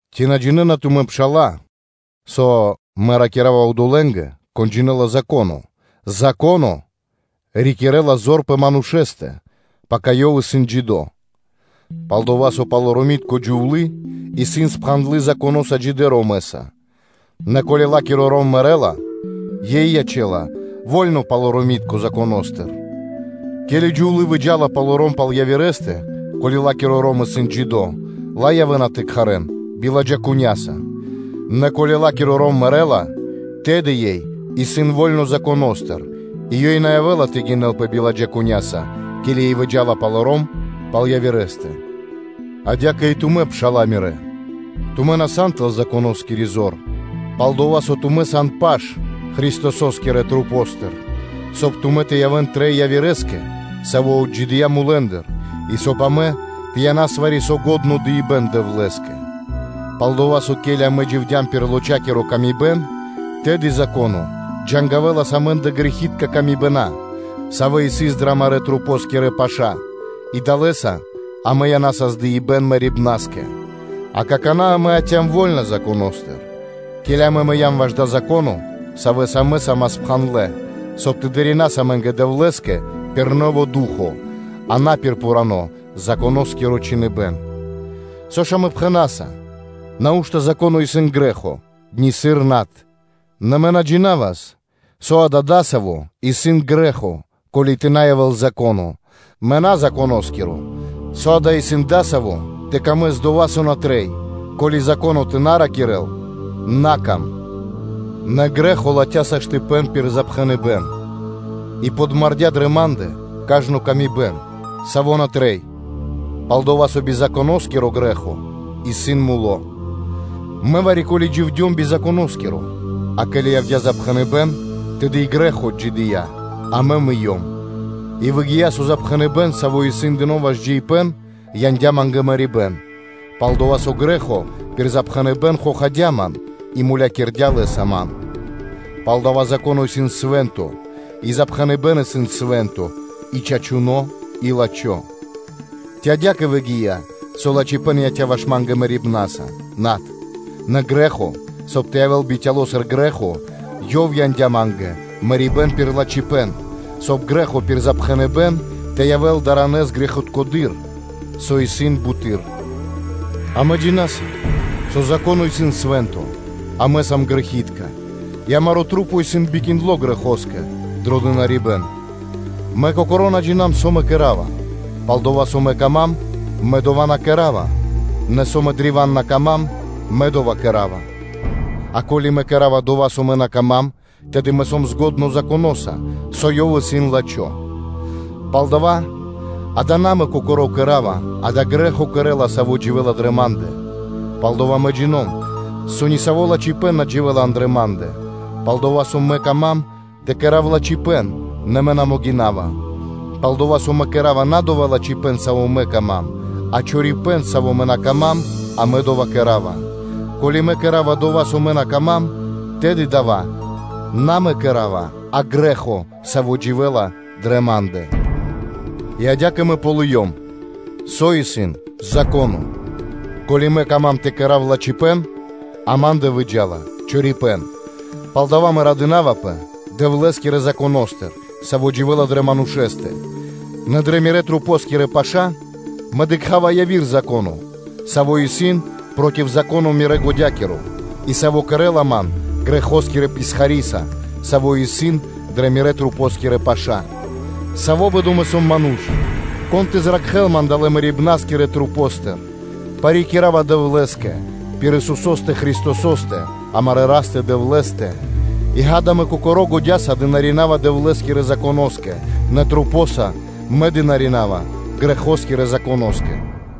Ци на джинэ́на тумэ́, пшала́лэ, со (мэ ракира́ва одолэ́нгэ, кон джинэ́ла Зако́но): Зако́но рикирэ́ла зор пэ манушэ́стэ, пака ёв исын джидо́? Пал-дова́ со палоромитко джувлы́ исын спхандлы Законоса джидэ́ ромэса; нэ, ко́ли ла́киро ром мэрэ́ла, ёй ячэ́ла во́льно палоромитконэ Законо́стыр. Ке́ли джувлы́ выджа́ла палоро́м пал явирэ́стэ, ко́ли ла́киро ром исын джидо́, ла явэ́на тэ кхарэ́н биладжакуня́са; нэ ко́ли ла́киро ром мэрэ́ла, тэды ёй исын во́льно Законо́стыр, и ёй на явэ́ла тэ гинэлпэ биладжакуняса, ке́ли ёй выджа́ла палоро́м пал явирэ́стэ. Адя́кэ и тумэ́, пша́ла мирэ́, тумэ́ на сан тэл Законоскири зор, пал-дова́ со тумэ́ сан паш Христосо́скирэ масэ́ндыр, соб (кай) тумэ́ тэ явэ́н трэй Явирэ́скэ, Саво́ отджидыя́ мулэ́ндыр, и соб (кай) амэ тэ янас вари-саво́ лачхо́ дыибэ́н Дэвлэ́скэ. Пал-дова́ со, ке́ли амэ дживдям пир лочакиро тырдыпэ́н, тэды Зако́но джангавэлас амэ́ндэ грэхи́тка камибэна, савэ́ сыс дрэ амарэ́ масэнгирэ паша́ и далэ́са амэ янасас дыибэ́н мэрибна́скэ; а какана́, амэ яця́м вольна Законо́стыр, ке́ли амэ мыям ваш дава́ Зако́но, савэ́са амэ са́мас спхандлэ, соб (кай) тэ дынарина́с амэ́нгэ Дэвлэ́скэ пир нэво́ Ду́хо (Фа́но), а на пир пхурано́ Законоскиро чхиныбэ́н. Со ж амэ пхэна́са? Нау́што Зако́но исын грэ́хо? Нисыр над! Нэ мэ на джинавас, со дава́ дасаво исын грэ́хо, ко́ли тэ на явэ́л Зако́но: мэ на сом Законоскиро, со дава́ исын дасаво тэ причхувэс ило́ кэ дова́, со на трэй, ко́ли Зако́но тэ на ракирэ́л: “На кам.” Нэ грэ́хо латхя́ саштыпэн пир запхэныбэн и подмардя дрэ ма́ндэ кажно тырдыпэ́н, саво́ на трэй, пал-дова́ со би Законоскиро грэ́хо исын муло́. Мэ вари-ке́ли дживдём би Законоскиро: а ке́ли явдя́ запхэныбэн, тэды и грэ́хо отджидыя́, а мэ мыём. И выгия́, со запхэныбэн, саво́ исын дыно́ ваш джиибэ́н, яндя́ ма́нгэ мэрибэ́н: пал-дова́ со грэ́хо пир запхэныбэн хохадя ман и мулякирдя́ лэ́са ман. Палдава́ Зако́но исын свэ́нто, и запхэныбэн исын свэ́нто, и чачуно́ и лачхо́. Ци адя́кэ выгия́, со лачхипэ́н яця́ ваш ма́нгэ мэрибнаса? Над. Нэ грэ́хо, соб (кай) тэ явэ́л бицяло́ сыр грэ́хо, ёв яндя́ ма́нгэ мэрибэ́н пир лачхипэ́н, соб (кай) грэ́хо пир запхэныбэн тэ явэ́л даранэс грэхиткэдыр, со исын буты́р. Амэ джина́са, со Зако́но исын свэ́нто, а амэ сам грэхи́тка, и амарэ́ маса́ исын бикиндло грэхоскэ дро дынарибэ́н. Мэ кокоро́ на ґалёвава, со мэ кэра́ва; пал-дова́ со мэ кама́м, мэ дова́ на кэра́ва, нэ со мэ древа́н на кама́м, мэ дова́ кэра́ва. А ко́ли мэ кэра́ва дова́, со ма́нгэ на пир ило́, тэды мэ сом дро екхипэ́н Законоса, со ёв исын лачхо́. Палдава́, акэ на мэ кокоро́ кэра́ва, а дава́ грэ́хо кэрэ́ла, саво́ дживэ́ла дрэ ма́ндэ. Палдова́ мэ джино́м, со нисаво́ лачхипэ́н на дживэ́ла андра́л ма́ндэ; пал-дова́ со мэ кама́м тэ кэра́в лачхипэ́н, нэ мэ на могина́ва. Пал-дова́ со мэ кэра́ва на дова́ лачхипэ́н, саво́ мэ кама́м, а чорипэ́н, саво́ мэ на кама́м, а мэ дова́ кэра́ва. Ко́ли мэ кэра́ва дова́, со мэ на кама́м, тэды дава́ на мэ кэра́ва, а грэ́хо, саво́ дживэ́ла дрэ ма́ндэ. И адя́кэ мэ ґалыём, со дасаво исын Зако́но, ко́ли мэ кама́м тэ кэра́в лачхипэ́н, а ма́ндэ выджа́ла чорипэ́н. Палдава́ мэ радынавпэ Дэвлэ́скирэ Законо́стыр, саво́ дживэ́ла дрэ манушэ́стэ: нэ дрэ мирэ́ масэнгирэ паша́, мэ дыкха́ва яви́р Зако́но, саво́ исын проти Зако́но мирэ́ годя́киро и саво́ кэрэ́ла ман грэхоскирэ писхариса, саво́ исын дрэ мирэ́-масэнгирэ паша́. Саво́ бэдо мэ сом ману́ш! Кон тэ зракхэлас ман далэ́ мэрибнаскирэ масэ́ндыр? Парикирава Дэвлэ́скэ пир Исусо́стэ Христосо́стэ, амарэ́ Растэ-Дэвлэ́стэ. И ґа́да, мэ кокоро́ годя́са дынарина́ва Дэвлэ́скирэ Законо́скэ, нэ масэнца мэ дынарина́ва (служынава) грэхо́скирэ Законо́скэ.